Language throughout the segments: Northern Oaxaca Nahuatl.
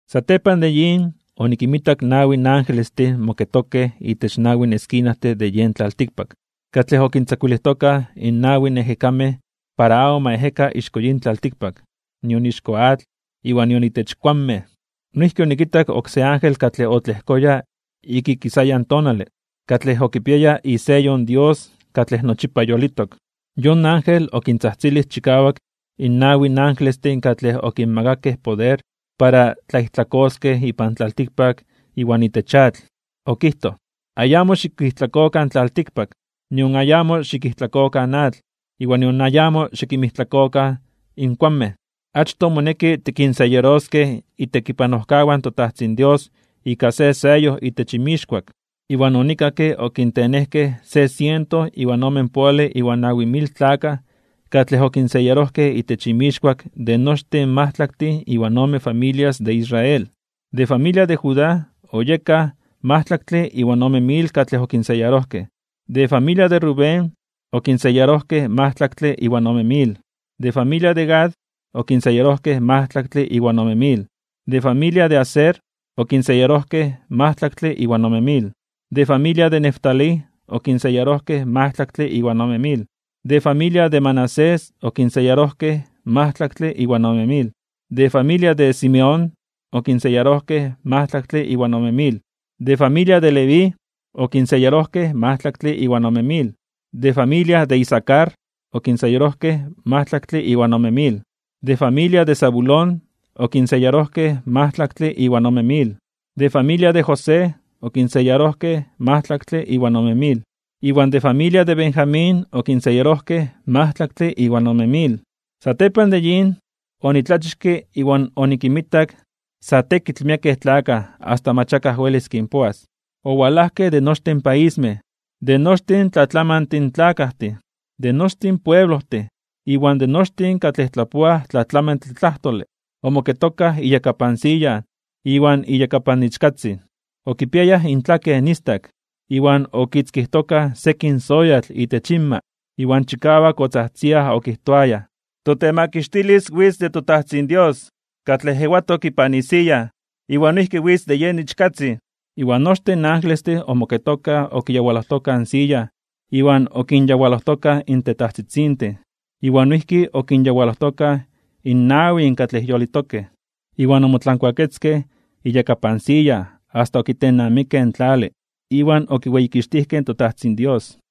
Satepan de yin, onikinmitak nawi angelestin moketokej itech nawi eskinajtin de yen tlaltikpak, katlej okintzakuilijtokaj in nawi ejekamej para amo ma ejeka ixko yin tlaltikpak, nion ixko atl, iwan nion itech kuanmej. Noijki onikitak oksé ángel katlej otlejkoya ik ikisayan tonale, katlej okipiaya iseyo in Dios katlej nochipa yolitok. Yon ángel okintzajtzilij chikawak in nawi angelestin katlej okinmakakej poder para tlaijtlakoskej ipan tlaltikpak iwan itech atl, okijtoj: ―Ayamo xikijtlakokan in tlaltikpak, nion ayamo xikijtlakokan in atl, iwan nion ayamo xikinmijtlakokan in kuanmej, achtoj moneki tikinseyaroskej itekipanojkawan in toTajtzin Dios ika se seyo itech inmixkuak. Iwan onikakke okintenejkej se siento iwan omenpoale iwan nawi mil tlakaj katlej okinseyarojkej itech inmixkuak de nochtin in majtlaktin iwan ome familias de Israel. De familia de Judá oyekaj majtlaktle iwan ome mil katlej okinseyarojkej. De familia de Rubén okinseyarojkej majtlaktle iwan ome mil, de familia de Gad okinseyarojkej majtlaktle iwan ome mil, de familia de Aser okinseyarojkej majtlaktle iwan ome mil, de familia de Neftalí okinseyarojkej majtlaktle iwan ome mil, de familia de Manasés okinseyarojkej majtlaktle iwan ome mil, de familia de Simeón okinseyarojkej majtlaktle iwan ome mil, de familia de Leví okinseyarojkej majtlaktle iwan ome mil, de familia de Isacar okinseyarojkej majtlaktle iwan ome mil, de familia de Zabulón okinseyarojkej majtlaktle iwan ome mil, de familia de José okinseyarojkej majtlaktle iwan ome mil, iwan de familia de Benjamín okinseyarojkej majtlaktle iwan ome mil. Satepan de yin, onitlachixke iwan onikinmitak sa tekitl miekej tlakaj asta mach akaj welis kinpoas. Owalajkej de nochtin paismej, de nochi tlatlamantin tlakajtin, de nochtin pueblojtin, iwan de nochtin katlej tlapoaj tlatlamantle tlajtole. Omoketokaj iyakapan siya iwan iyakapan in Ichkatzin. Okipiayaj intlaken istak iwan okikitzkijtokaj sekin soyatl itech inma. Iwan chikawak otzajtziaj, okijtoayaj: Totemakixtilis witz de toTajtzin Dios, katlej ewatok ipan isiya, iwan noijki witz de yen Ichkatzin. Iwan nochtin in angelestin omoketokaj okiyawalojtokaj in siya iwan okinyawalojtokaj in tetajtzitzintin, iwan noijki okinyawalojtokaj in nawin katlej yolitokej. Iwan omotlankuaketzkej iyakapan siya asta okitennamikej in tlale iwan okiweyikixtijkej in toTajtzin Dios.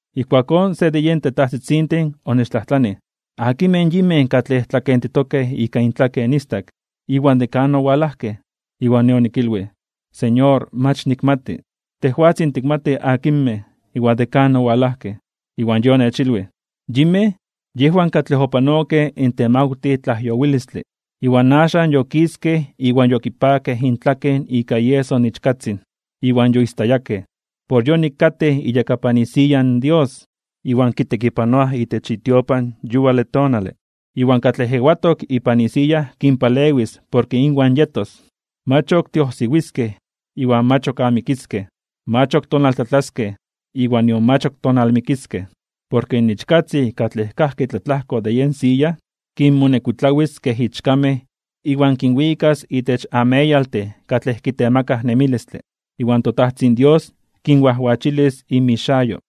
Ijkuakón se de yen tetajtzitzintin onechtlajtlanij: ―¿Akinmej yinmej katlej tlakentitokej ika intlaken istak, iwan de kan owalajkej? Iwan nej onikilwij: ―Señor, mach nikmati. Tejwatzin tikmati akinmej iwan de kan owalajkej. Iwan Yej onechilwij: ―Yinmej yejwan katlej opanokej in temawtij tlajyowilistle. Iwan axan yokiskej iwan yokipakej intlaken ika ieso in Ichkatzin iwan yoistayakej. Por yonik katej iyakapan isiya in Dios, iwan kitekipanoaj itech itiopan yuale tonale. Iwan katlej ewatok ipan isiya kinpalewis porke inwan yetos. Mach ok tiojsiwiskej iwan mach ok amikiskej, mach ok tonaltlatlaskej iwan nion mach ok tonalmikiskej. Porke in Ichkatzin katlej kajki tlatlajko de yen siya, kinmonekuitlawis kej ichkamej iwan kinwikas itech ameyaltin katlej kitemakaj nemilistle. Iwan toTajtzin Dios kinwajwachilis inmixayo.